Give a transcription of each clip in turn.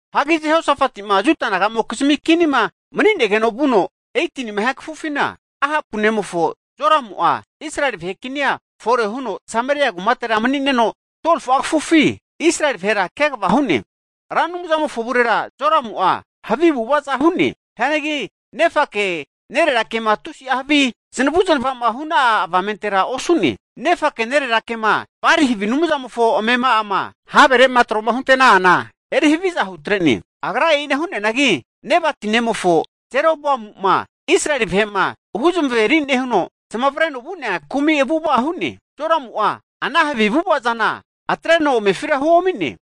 Hagi Jehosafati'ma Juda naga'mokizmi kinima mani'negeno vuno 18nima hia kafufina, Ahapu nemofo Joramu'a Israeli vahe kinia fore huno Sameria kumatera mani'neno 12fu'a kafufi Israeli vahera kegava hu'ne. Ra Anumzamofo avurera Joramu'a havi avu'avaza hu'ne. Hianagi nefake nererake'ma tusi'a havi zanavu zanava'ma hu'na'a avamentera osu'ne. Nefake nererakema Bali havi anumzamofo amema'ama havere'ma tro'ma hunte'na'ana eri haviza hutre'ne. Agra e'ina hu'neanagi Nebati nemofo Jeroboamu'ma Israeli vahe'ma huzamaveri nehuno, zamavareno vu'nea kumi avu'ava hu'ne. Jeramu'a ana havi avu'ava zana atreno amefira huomi'ne.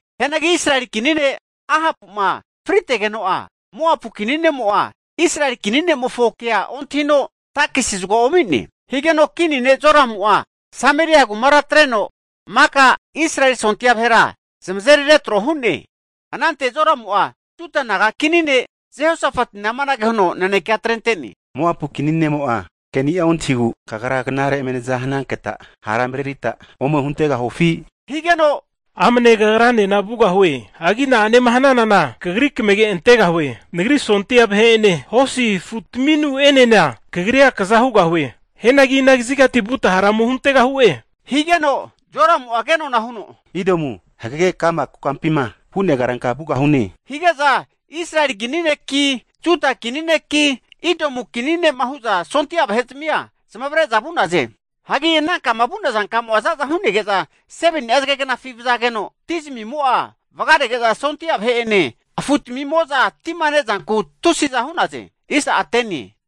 Hianagi Israeli kini ne' Ahapu'ma fritegeno'a, Moapu kini ne'mo'a Israeli kini ne'mofonkea ontahino takisia zagoa omi'ne. Higeno kini ne' Joramu'a Sameria kumara atreno maka Israeli sondia vahera zamazeri retro hu'ne. Anante Joramu'a Juda kini ne' Jehosafatina amanage huno nanekea atrente'ne, Moapu kini ne'mo'a keni'a ontahigu, kagra knare eme naza hananketa hara marerita ome huntegahufi! Higeno amne kagranena vugahue. Hagi na'anema hnanana kagri kamage antegahue. Nagri sondia vahe'ene hosi afutaminu'enena kagria kaza hugahue. Hianagi ina kazigati vuta hara ome huntegahu'e, higeno Joramu'a ke nona'a huno, Idomu hagege ka'ma kokampima vu'nea karanka vugahune. Hige'za Israeli kini neki, Juda kini neki, Idomu kini ne'ma hu'za sondia vahe'zamia zamavare'za vu'naze. Hagi anankama vu'naza kamo'a zaza hu'nege'za 7ni'a zagefi vazageno, ti zamimo'a vagarege'za sondia vahe'ene afutamimo'za tima nezanku tusiza hu'naze.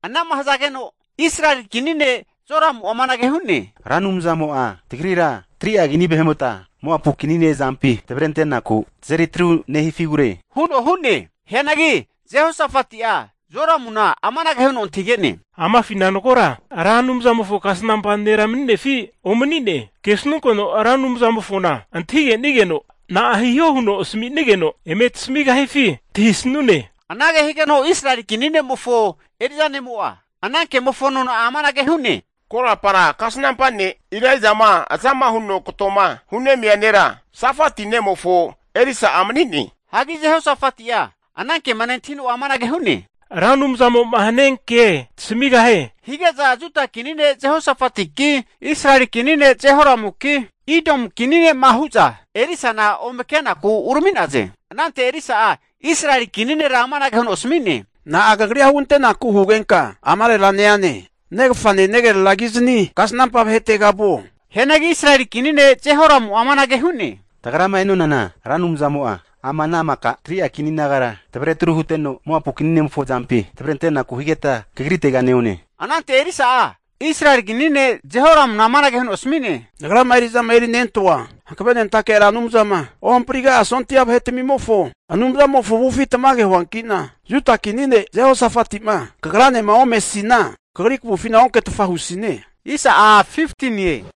Anama hazageno Israeli kini ne' Joramu'a amanage hu'ne, Ra Anumzamo'a tagrira 3'a kini vahe'mota, Moapu kini ne' azampi tavrentenaku tazeri atru nehifigure huno hu'ne. Hianagi Jehosafati'a Joramuna amanage huno antahige'ne, Amafina magora Ra Anumzamofo kasnampa nera mani'nefi omani'ne, kesnunkeno Ra Anumzamofona antahigenigeno na'a hiho huno asminigeno eme tasamigahifi antahisanune. Anage higeno Israeli kini ne'mofo eri'za ne'mo'a, ana kemofo nona'a amanage hu'ne, Korapara kasnampa ne' Elaijama azama huno katoma hunemia nera Safati nemofo Elisa'a mani'ne. Hagi Jehosafati'a ana kema nentahino'a amanage hu'ne, Ra Anumzamo'ma hanianke tasamigahie hige'za, Juda kini ne' Jehosafatiki, Israeli kini ne' Jehoramuki, Idomu kini ne'ma hu'za Elisana ome kenaku urami'naze. Anante Elisa'a Israeli kini nera amanage huno asmi'ne, Na'a kagrira hugantenaku hugenka amarera neane? Negafane negreragizni kasnampa vahetega vuo. Hianagi Israeli kini ne' Jehoramu'a amanage hu'ne, Tagrama e'nonana, Ra Anumzamo'a ama ana maka 3'a kini nagara tavre atru huteno Moapu kini ne'mofo azampi tavrentenaku higeta kagrite neone. Anante Elisa'a Israeli kini ne' Jehoramuna amanage huno asmi'ne, Nagrama eri'zama erinentoa hankvenentake Ra Anumzama ohampriga'a sondia vahetamimofo Anumzamofo avufi tamage huanki'na, Juda kini ne' Jehosafati'ma kagranema omesina kagri kavufina onketfa husine.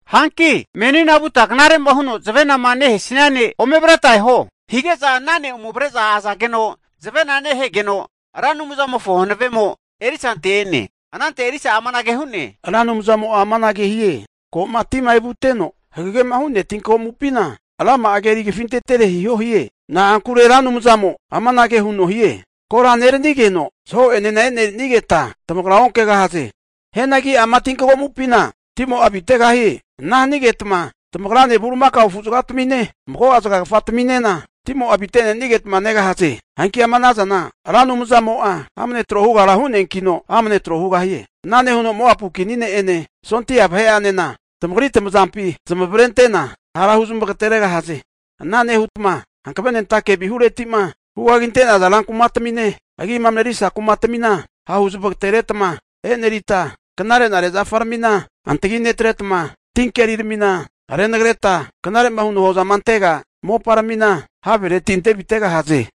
Hanki menina vuta knare'ma huno zavenama nehesia ne' ome avreta eho. Hige'za ana ne' ome avre'za azageno zavena nehegeno, Ra Anumzamofo hanavemo Elisante e'ne. Anante Elisa'a amanage hu'ne, Ra Anumzamo'a amanage hie, ko'ma tima evuteno hagegema hu'nea tinkagomupina rama'a keri kafintetere hiho hie. Na'ankure Ra Anumzamo'a amanage huno hie, Kora neranigeno zaho'enena e'nerinigeta tamagra onkegahaze. Hianagi ama tinkagomupina timo'a avitegahie. Ana hanigetma tamagrane, bulimakao afu zagatamine, mago'a zagagafa tami'nena timo'a avite'nenigetma negahaze. Hanki ama anazana Ra Anumzamo'a amne tro hugara hu'neankino, amne tro hugahie. Ana nehuno Moapu kini ne'ene sondia vahe'anena tamagri tamazampi zanavrentena hara hu zamagateregahaze. Ana nehutma hankave nentake vihureti'ma hu kaginte'naza rankumatamine, agima marerisa kumatmina hahu zamagateretma e'nerita, knarenare zafaramina antagi netretma, tinkeriramina renagreta, knare'ma huno hozama antega moparamina havereti ante avitegahaze.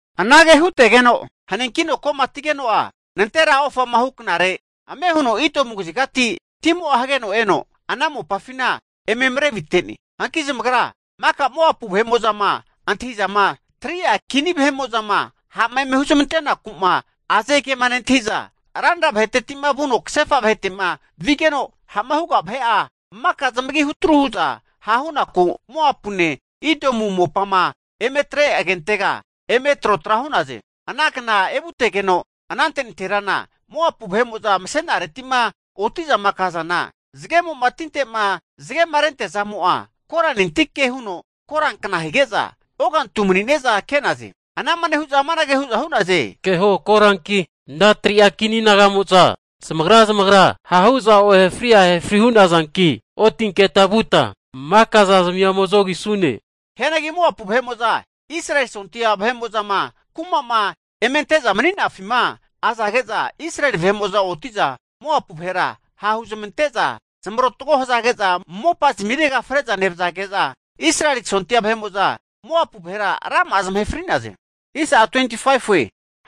Anage hutegeno haninkino komatigeno'a nantera ofama huknare ame huno Idomu kazigati timo'a hageno eno, ana mopafina eme marevite'ne. Hanki zamagra maka Moapu vahe'mo'zama antahizama, 3'a kini vahe'mo'zama ha'ma eme huzmanteku'ma aze ke'ma nentahi'za, ranra vaheteti vuno kasefa vahetema vigeno ha'ma huga vahe'a maka zamagi hutru hu'za hahunaku Moapune, Idomu mopama eme atre agentega eme trotra hu'naze. Ana kna evutegeno anante nanterana Moapu vahe'mo'za mase'nareti'ma oti'zama kazana, zagemo'ma tinte'ma zagemarentea zamo'a koranentike huno korankna hige'za, ogantu mani'ne'za ke'naze. Anama nehu'za amanage hu'za hu'naze, keho koranki, ana 3'a kini naga'mo'za zamagra zamagra ha' hu'za ohefri ahefri hu'negahazanki, otinketa vuta maka zazamia ome zogisune hu'naze. Hianagi Moapu vahe'mo'za Israeli sondia vahe'mo'zama kuma'ma eme ante'za mani'nafima azage'za, Israeli vahe'mo'za oti'za Moapu vahera ha' huzamante'za zamarotgo hazage'za, mopa zamirega fre'za nevazage'za Israeli sondia vahe'mo'za Moapu vahera rama'a zamahe fri'naze.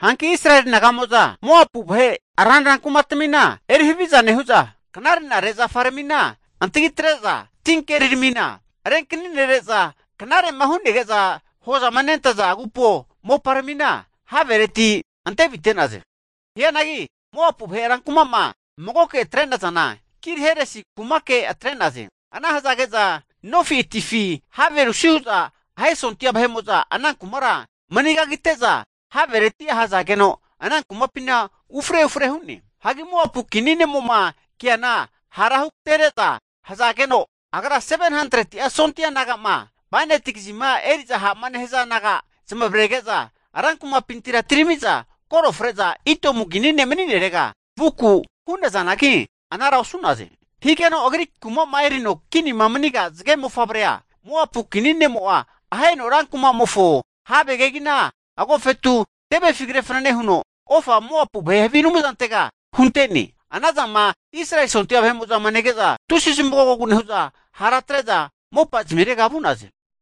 Hanki Israeli naga'mo'za Moapu vahe ranra kumatmina eri haviza nehu'za, knare'nare zafaramina antagi netre'za, tinkeri ramina renkaninere'za, knare'ma hu'nege'za hozama nentaza agupo moparamina havereti antevite'naze. Hianagi Moapu vahe rankuma'ma magoke atre'nazana Kir-heresi kumake atre'naze. Ana hazage'za nofi atifi have rusi hu'za ahe sondia vahe'mo'za ana kumara mani kagintete'za, havereti ahazageno ana kumapina ufre ufre hu'ne. Hanki Moapu kini ne'mo'ma keana ha'ra hugatereza hazageno, agra 700'a sondia naga'ma bainati kazima eri'za ha'ma nehaza naga zamavarege'za, rankumapintira atirami'za koro fre'za Idomu kini ne' mani'nerega vuku hu'nazanagi, anara osu'naze. Higeno agri kuma'ma erino kinima maniga zage mofavrea Moapu kini ne'mo'a aheno rankumamofo have kegina agofetu, tevefi kre fanane huno ofa Moapu vahe havi anumzantega hunte'ne. Anazama Israeli sondia vahe'mo'zama nege'za tusi zamagogogu nehu'za, hara atre'za mopa zamirega vu'naze.